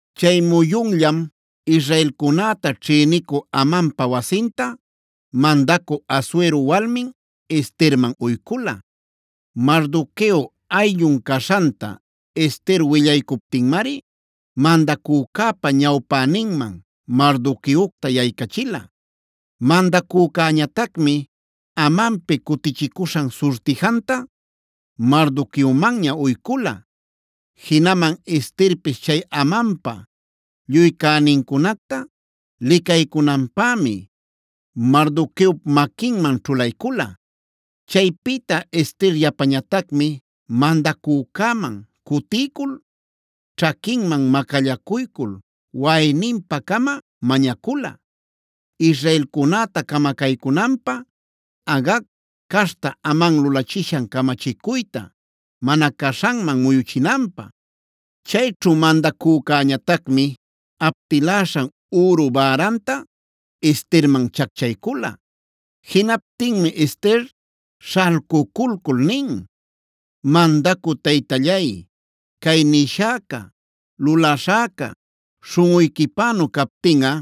Chay muyunllam israelcunäta ćhïnicü Amanpa wasinta, mandacü Asuero walmin Esterman uycula. Mardoqueo ayllun caśhanta Ester willaycuptinmari, mandacücäpa ñawpäninman Mardoqueocta yaycachila. Mandacücäñatacmi Amanpi cutichicuśhan surtijanta Mardoqueomanña uycula. Jinaman Esterpis chay Amanpa lluy cänincunacta licaycunanpämi Mardoqueop maquiman ćhulaycula. Chaypïta Ester yapañatacmi mandacücäman cutiycul ćhaquinman macallacuycul waꞌayninpa-cama mañacula, israelcunäta camacaycunanpä Agag caśhta Aman lulachishan camachicuyta mana caśhanman muyuchinanpä. Chayćhu mandacücäñatacmi aptiläśhan üru bäranta Esterman chacchaycula. Jinaptinmi Ester śhalcuculcul nin: “Mandacü taytallay, cay nishäca, luläśhäca śhunꞌuyquipänu captinꞌa,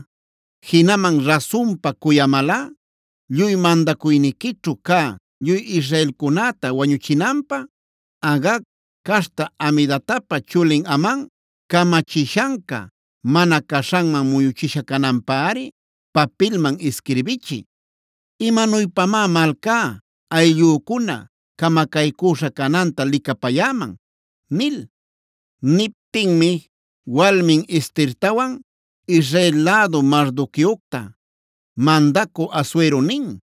jinaman rasunpa cuyamalꞌa lluy mandacuyniquićhu cä lluy israelcunäta wañuchinanpä, Agag caśhta Hamedatapa chulin Aman camachishanca, mana caśhanman muyuchisha cananpäri papilman isquirbichiy. ¿Imanuypamá malcá, ayllücuna camacaycuśha cananta licapayäman?” nil. Niptinmi walmin Estertawan Israel lädu Mardoqueocta mandacü Asuero nin: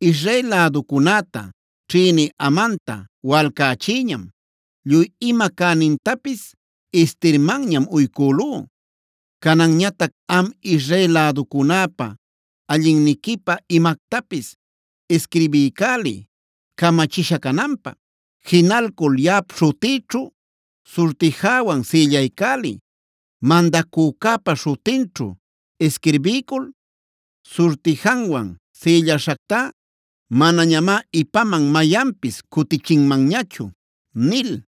“Israel läducunäta ćhïnï Amanta walcächïñam. Lluy ima cänintapis Estermanñam uycülú. Cananñatac am Israel läducunäpä allinniquipä imactapis isquirbiycäliy, camachisha cananpä. Jinalcul yaꞌap śhutïćhu surtijäwan sïllaycäliy. Mandacücäpa śhutinćhu isquirbiycul surtijanwan sïlläśhactá manañamá ipaman mayanpis cutichinmanñachu” nil.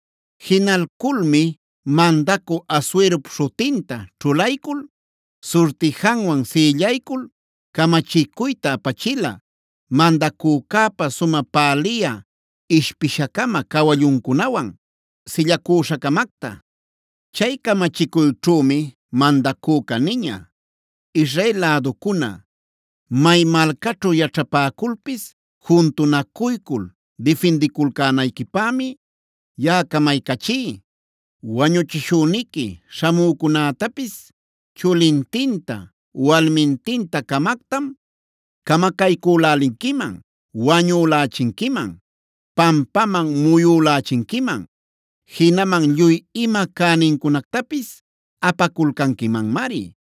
Jinalculmi mandacü Asuerop śhutinta ćhulaycul, surtijanwan sïllaycul camachicuyta apachila, mandacücäpa sumä päliyä ishpisha-cama cawalluncunawan silläcuśha-camacta. Chay camachicuyćhümi mandacüca niña: “Israel läducuna, may malcaćhu yaćhapäculpis juntunacuycul difindiculcänayquipämi yaꞌa camaycachí. Wañuchishüniqui śhamücunätapis chulintinta walmintinta-camactam camacaycülälinquiman, wañülächinquiman, pampaman muyülächinquiman; jinaman lluy ima cänincunactapis apaculcanquimanmari.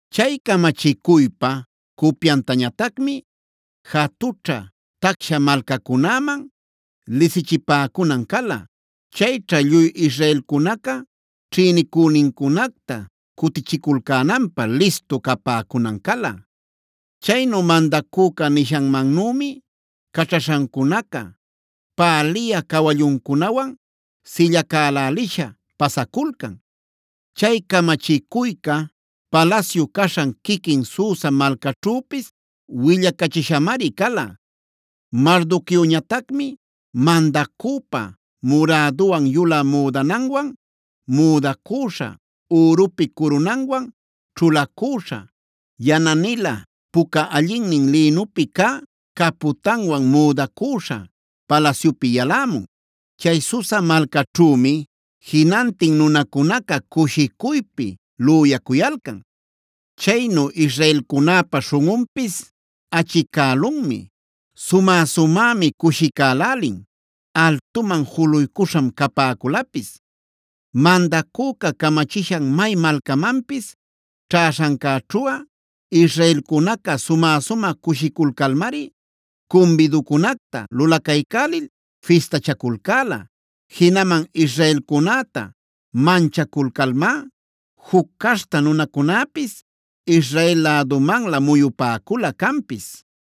Chay camachicuypa cupyantañatacmi jatućhä tacsha malcacunäman lisichipäcunan cala. Chayćha lluy israelcunaca ćhïnicünincunacta cutichiculcänanpä listu capäcunan cala. Chaynu mandacüca nishanmannümi caćhaśhancunaca päliyä cawalluncunawan sillacälälisha pasaculcan. Chay camachicuyca palasyu caśhan quiquin Susa malcaćhüpis willacachishamari cala. Mardoqueoñatacmi mandacüpa muräduwan yulä müdananwan müdacüśha, ürupi curunanwan ćhulacüśha, yana-nilä puca allinnin lïnupi cä capütanwan müdacüśha palasyupi yalämun. Chay Susa malcäćhümi jinantin nunacunaca cushicuypi lüyacuyalcan. Chaynu israelcunäpa śhunꞌunpis achicälunmi, sumä-sumämi cushicälälin, altuman juluycuśham capäculapis. Mandacüca camachishan may malcamanpis ćhäśhancäćhuꞌa israelcunaca sumä-sumä cushiculcalmari cumbiducunacta lulacaycälil fistachaculcäla. Jinaman israelcunäta manchaculcalmá juc caśhta nunacunäpis Israel lädumanlä muyupäcula canpis.